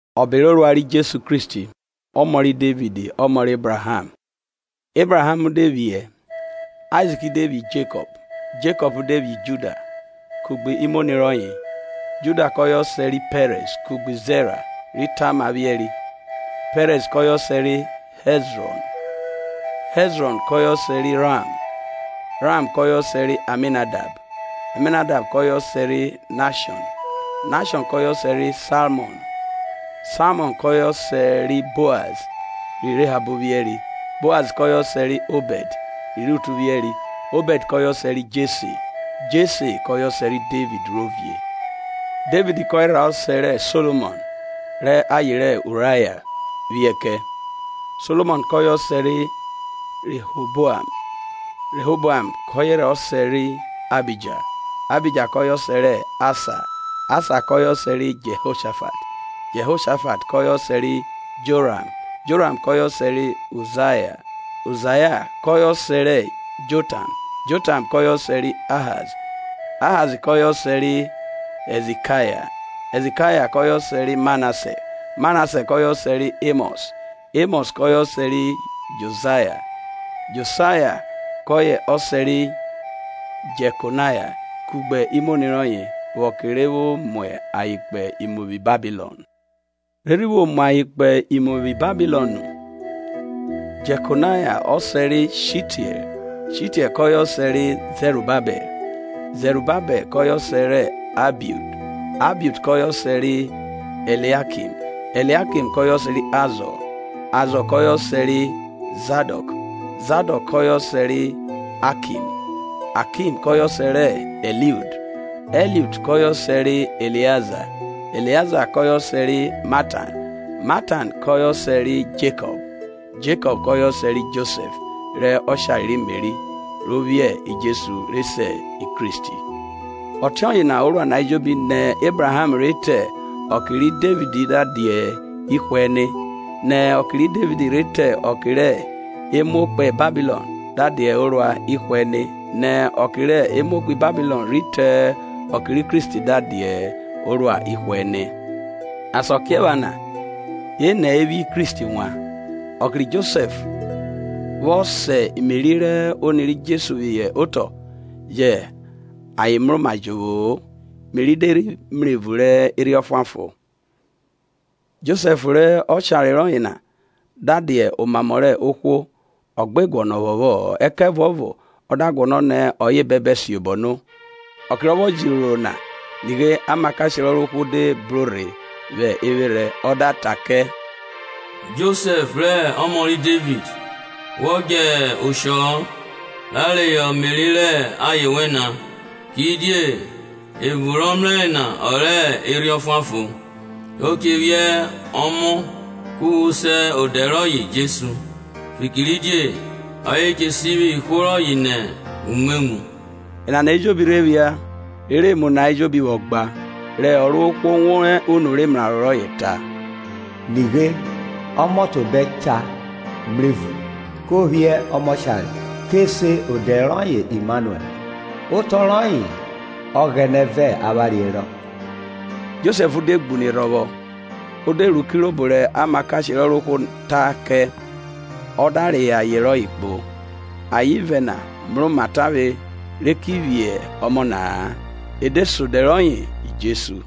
Ọbe rẹ orua rẹ Jesu Kristi, ọmọ rẹ Devid; ọmọ rẹ Ebraham. Ebraham de vwiẹ Aizik, Aizik de vwiẹ Jekọp, Jekọp de vwiẹ Juda kugbe imoni rọye, Juda kọye ọsẹ ri Pẹrẹz kugbe Zera ri Tama vwiẹri, Pẹrẹz kọye ọsẹ ri Hẹzrọn, Hẹzrọn kọye ọsẹ ri Ram, Ram kọye ọsẹ rẹ Aminadab, Aminadab kọye ọse ri Nahshọn, Nahshọn kọye ọsẹ ri Salmọn. Salmọn kọye ọsẹ rẹ Boaz ri Rehab vwieri, Boaz kọye ọsẹ rẹ Obẹd rẹ Rutu vwiẹri, Obẹd kọye ọsẹ rẹ Jesse, Jesse kọye ọsẹ rẹ Devid rẹ ovie. Devid kọye rha ọsẹ rẹ Solomọn rẹ aye rẹ Uraiya vwiẹ kẹ. Solomọn kọye ọsẹ ri Rẹhoboam, Rẹhoboam kọye ọsẹ ri Ahija, Ahija kọye ọsẹ rẹ Asa, Asa kọye ọsẹ ri Jehoshafat, Jehoshafat kọye ọsẹ ri Joram, Joram kọye ọsẹ rẹ Uzaiya, Uzaiya kọye ọsẹ ri Jotam, Jotam kọye ọsẹ rẹ Ahaz, Ahaz kọye ọsẹ ri Hẹzikaya, Hẹzikaya kọye ọsẹ ri Manase, Manase kọye ọsẹ rẹ Emọs, Emọs kọye ọsẹ ri Josaya, Josaya kọye ọsẹ ri Jekonaya kugbe imọni rọye, vwẹ ọke rẹ vwo mu ayen kpo imu vwi Babilọn. Re rhi vwo mu ayen kpo imu vwi Babilọn nu, Jekonaya ọsẹ ri Shitiẹl, Shitiẹl kọye ọsẹ ri Zerubabẹl, Zerubabẹl kọye ọsẹ rẹ Ahiud, Ahiud kọye ọsẹ rẹ Eliakim, Eliakim kọye ọsẹ Azọ, Azọ kọye ọsẹ ri Zadọk, Zadọk kọye ọsẹ rẹ Akim, Akim kọye ọsẹ rẹ Ẹliud, Ẹliud kọye ọsẹ rẹ Eleaza, Eleaza kọye ọsẹ ri Matan, Matan kọye ọsẹ ri Jekọp, Jekọp kọye ọsẹ ri Josẹf rẹ ọshare ri Meri, ro vwiẹ Jesu, re se Kristi. Ọtiọye na orua na ejobi nẹ Ebraham rhe ri te ọke ri Devid da dia ihwe-ẹne. Nẹ ọke ri Devid rhe ri te ọke rẹ emuo kpo Babilọn da dia orua ihwe-ẹne. Nẹ ọke rẹ emuo kpo Babilọn rhi te ọke ri Kristi da dia orua ihwe-ẹnẹ. Asakiephana enẹ e vwiẹ Kristi wan. Ọke ri Josẹf vwọ sa Meri rẹ oni ri Jesu phihọ otọ, yẹ ayen je rhe mroma-a, Meri da rhe mrevun rẹ Erhi Ọfuanfon; Josẹf rẹ oshare rọye na, da dia omamọ rẹ ohwo, ọ gbe guọnọ phọphọ-ọ, ẹkẹvuọvo ọ da guọnọ nẹ ọye bẹbẹ siobọ no. Ọke rọ vwọ jẹ iroro na, nighe amakashe rẹ Ọrovwohwo de bro rhe vwẹ evwerhẹ, ọ da ta kẹ, Josẹf rẹ ọmọ ri Devid, wọ djẹ oshọ-ọ, ra reyọ Meri rẹ aye wẹ na, kidie evun rọ mrẹre na ọ rẹ Erhi Ọfuanfon. O che vwiẹ ọmọ ku wo se odẹ rọye Jesu, fikiridie ọye che sivwi ihwo rọye nẹ umwemwu. Enana ejobi rhe phia, rere emu na ejobi vwọ gba, rẹ Ọrovwohwo wan unu rẹ emraro rọye ta: Nighe, ọmọtobẹ cha mrevun, ko vwiẹ ọmọshare, ke se odẹ rọye Immanuẹl, otọ rọye Ọghẹnẹ vẹ avwanre herọ. Josẹf de gbune rhọvwo, o de ru kirobo rẹ amakashe rẹ Ọrovwohwo ta kẹ, ọ da reyọ aye rọye kpo. Ayen ivẹ na mroma tavwe re ki vwiẹ ọmọ na-a; o de se odẹ roye Jesu.